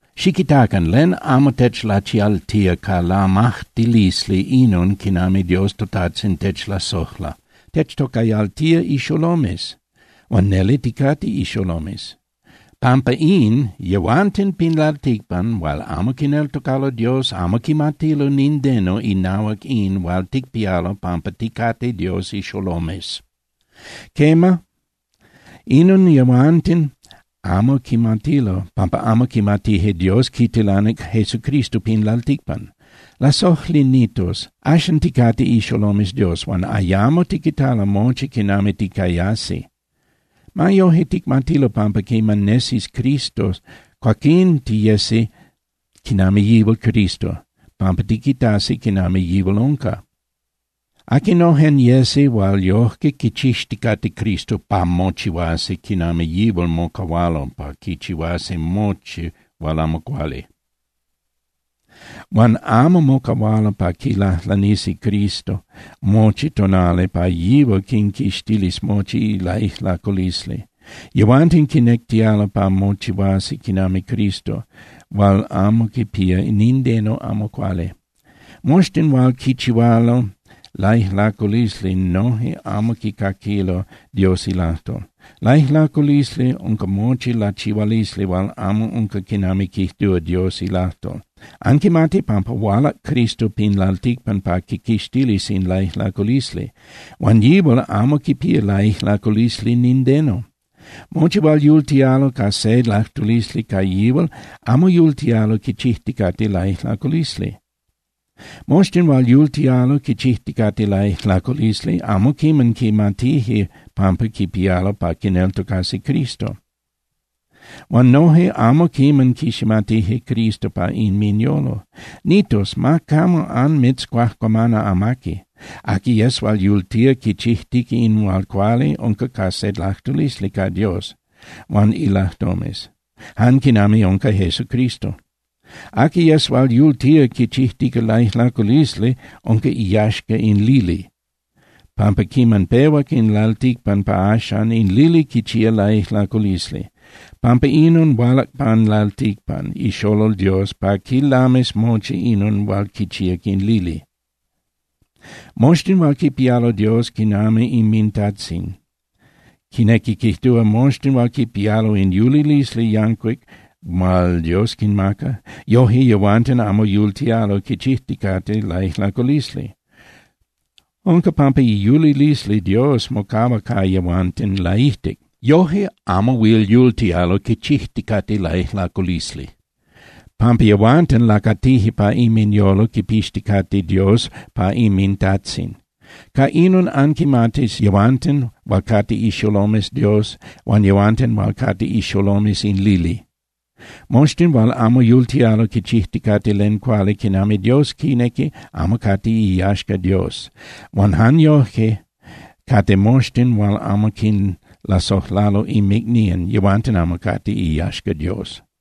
Xiquitacan, ¡len amo techlachialtía ca lamajtilisli inon quinami Dios toTajtzin techlasojla! ¡Techtocayaltía ixolomes, huan neli ticate ixolomes! Pampa in, yehuanten pin lalticpan hual amo quineltocalo Dios amo quimatilo nindeno inahuac in hual ticpialo pampa ticate Dios ixolomes. Quema, inon yehuanten amo quimatilo pampa amo quimatije Dios quitilanic Jesucristo pin lalticpan. Lasojli nitos, axcan ticate ixolomes Dios. Huan ayamo tiquitalo mochi quinami ticayasi. Ma yoje, ticmatilo pampa quiman nesis Cristo, cuaquín tiyesi quinami yihual Cristo, pampa tiquitasi quinami yihual unca. Aquinojen yesi hual yojque quichixticate Cristo pa mochihuasi quinami yihual mocahualo pa quichihuasi mochi hual amo cuali. Huan amo mocahualo pa quilajlanisi Cristo mochi tonali pa yihual quinquixtilis mochi laijlaculisli. Yehuanten quinectialo pa mochihuasi quinami Cristo hual amo quipía nindeno amo cuali. Moxtin hual quichihualo laijlaculisli noje amo quicaquilo Dios ilajtol. Laijlaculisli unca mochi lachihualisli hual amo unca quinami quijtúa Dios ilajtol. Anquimati pampa hualac Cristo pin lalticpan pa quiquixtilis in laijlaculisli. Huan yihual amo quipía laijlaculisli nindeno. Mochi hual yultialo ca se lajtulisli ca yihual amo yultialo quichijticate laijlaculisli. Moxtin hual yultialo quichijticate laijlaculisli amo quiman quimatije pampa quipialo pa quineltocasi Cristo. Huan noje amo quiman quiximatije Cristo pa inminyolo. Nitos, ma camo anmitzcuajcuamana amaqui. Aqui yes hual yultía quichijtica in hual cuali unca ca se lajtulisli ca Dios huan ilajtomes, jan quinami unca Jesucristo. Aqui yes hual yultía quichijtica laijlaculisli unca iyaxca in lili, pampa quiman pehuac in lalticpan pa axan, in lili quichía laijlaculisli. Pampa inon hualac pan lalticpan iXolol Dios pa quilamis mochi inon hual quichíac in lili. Moxtin hual quipialo Dios quinami inminTajtzin, quinequi quijtúa, moxtin hual quipialo in yulilisli yancuic hual Dios quinmaca, yoje yehuanten amo yultialo quichijticate laijlaculisli. Unca pampa iyulilisli Dios mocahua ca yehuanten laijtic. Yojque amo huil yultialo quichijticate laijlaculisli, pampa yehuanten lacatije pa inminyolo quipixticate Dios pa inminTajtzin. Ca inon anquimatis yehuanten hual cate ixolomes Dios huan yehuanten hual cate ixolomes in lili. Moxtin hual amo yultialo quichijticate len cuali quinami Dios quinequi amo cate iyaxca Dios, huan jan yojque cate moxtin hual amo quinlasojlalo inmicnían, yehuanten amo cate iyaxca Dios.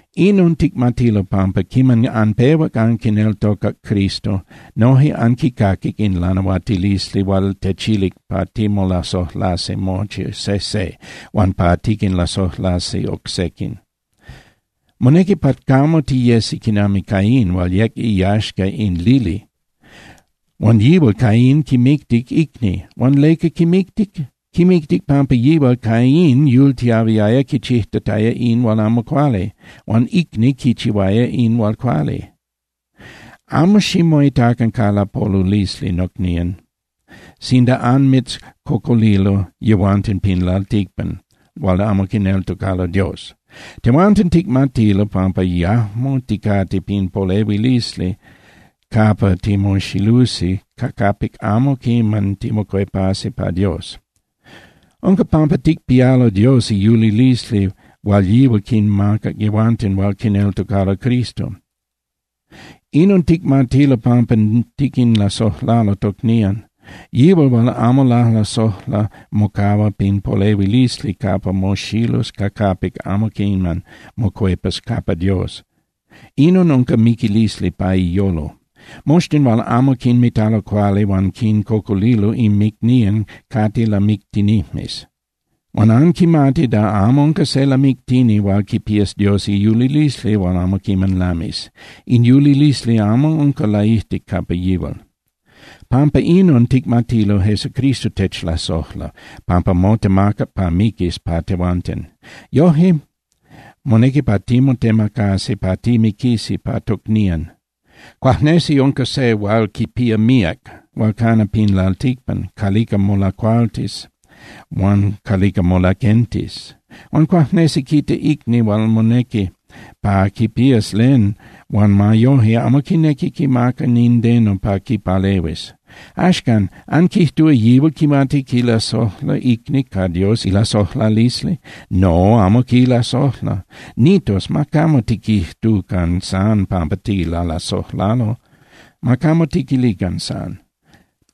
Inon ticmatilo, pampa quiman anpehuac anquineltocac Cristo, noje anquicaquic in lanahuatilisli hual techilic pa timolasojlasi mochi sejse, huan pa tiquinlasojlasi oc sequin. Monequi pa camo tiyesi quinami Caín hual yec iyaxca in lili, huan yihual Caín quimictic icni. Huan ¿leca quimictic? Quimictic pampa yihual Caín yultiahuiaya quichijtataya in hual amo cuali, huan icni quichihuaya in hual cuali. Amo ximoitacan ca lapolulisli, nocnían, sinda anmitzcocolilo yehuanten pin lalticpan hual amo quineltocalo Dios. Tehuanten ticmatilo pampa yajmo ticate pin polehuilisli capa timoxilusi ca capic amo quiman timocuepasi pa Dios. Unca pampa ticpialo Dios iyulilisli hual yihual quinmaca yehuanten hual quineltocalo Cristo. Inon ticmatilo pampa tiquinlasojlalo tocnían. Yihual hual amo lalasojla mocahua pin polehuilisli capa moxilus ca capic amo quiman mocuepas capa Dios. Inon unca miquilisli pa iyolo. Moxtin hual amo quinmitalo cuali huan quincocolilo inmicnían cate lamictinijmes. Huan anquimati da amo unca se lamictini hual quipía Dios iyulilisli hual amo quiman lamis. In yulilisli amo unca laijtic capa yihual. Pampa inon ticmatilo Jesucristo techlasojla, pampa motemacac pa miquis pa tehuanten. Yoje, monequi pa timotemacasi pa timiquisi pa tocnían. Cuajnesi unca se hual quipía míac hual cana pin lalticpan calica molacualtis huan calica molaquentis. Huan cuajnesi quita icni hual monequi pa quipías len huan ma yoje amo quinequi quimaca nindeno pa quipalehuis. Axcan, ¿anquijtúa yihual quimati quilasojla icni ca Dios ilasojlalisli? No, amo quilasojla. Nitos, ma camo tiquijtucan san pampa tilalasojlalo, ma camo tiquilican san.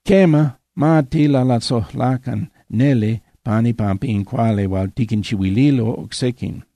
Quema, ma tilalasojlacan neli pan ipampa in cuali hual tiquinchihuililo oc sequin.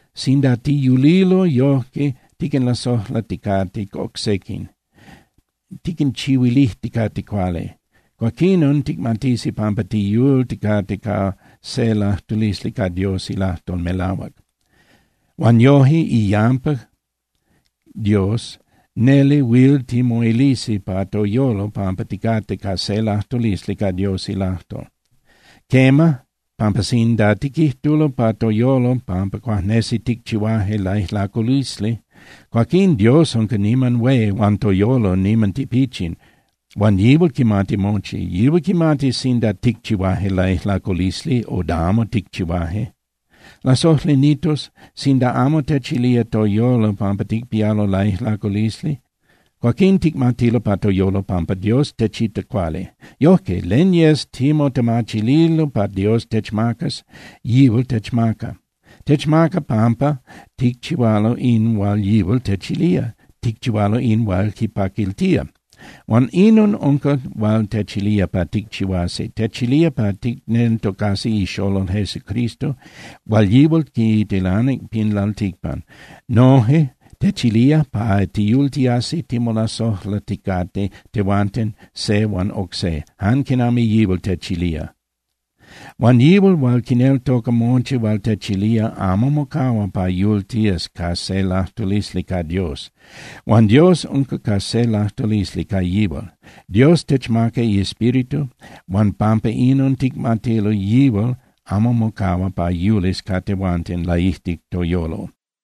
Sinda tiyulilo yojque tiquinlasojlaticate oc sequin, tiquinchihuilijticate cuali, cuaquinon ticmatisi pampa tiyulticate ca se lajtulisli ca Dios ilajtol melahuac. Huan yoje, iyampa Dios neli huil timoilisi pa toyolo pampa ticate ca se lajtulisli ca Dios ilajtol. Quema, pampa sinda tiquijtulo pa toyolo pampa cuajnesi ticchihuaje laijlaculisli, cuaquín Dios unca niman hué huan toyolo niman tipichin, huan yihual quimati mochi. Yihual quimatis sinda ticchihuaje laijlaculisli o da amo ticchihuaje. Lasojli nitos, sinda amo techilía toyolo pampa ticpialo laijlaculisli, cuaquín ticmatilo pa toyolo pampa Dios techita cuali. Yojque, len yes timotemachililo pa Dios techmacas, yihual techmaca. Techmaca pampa ticchihualo in hual yihual techilía, ticchihualo in hual quipaquiltía. Huan inon unca hual techilía pa ticchihuasi. Techilía pa ticneltocasi iXolol Jesucristo hual yihual quitilanic pin lalticpan. Noje techilía pa tiyultiasi timolasojlaticate tehuanten se huan oc se, jan quinami yihual techilía. Huan yihual hual quineltoca mochi hual techilía amo mocahua pa yultías ca se lajtulisli ca Dios, huan Dios unca ca se lajtulisli ca yihual. Dios techmaca iEspíritu huan pampa inon ticmatilo yihual amo mocahua pa yulis ca tehuanten laijtic toyolo.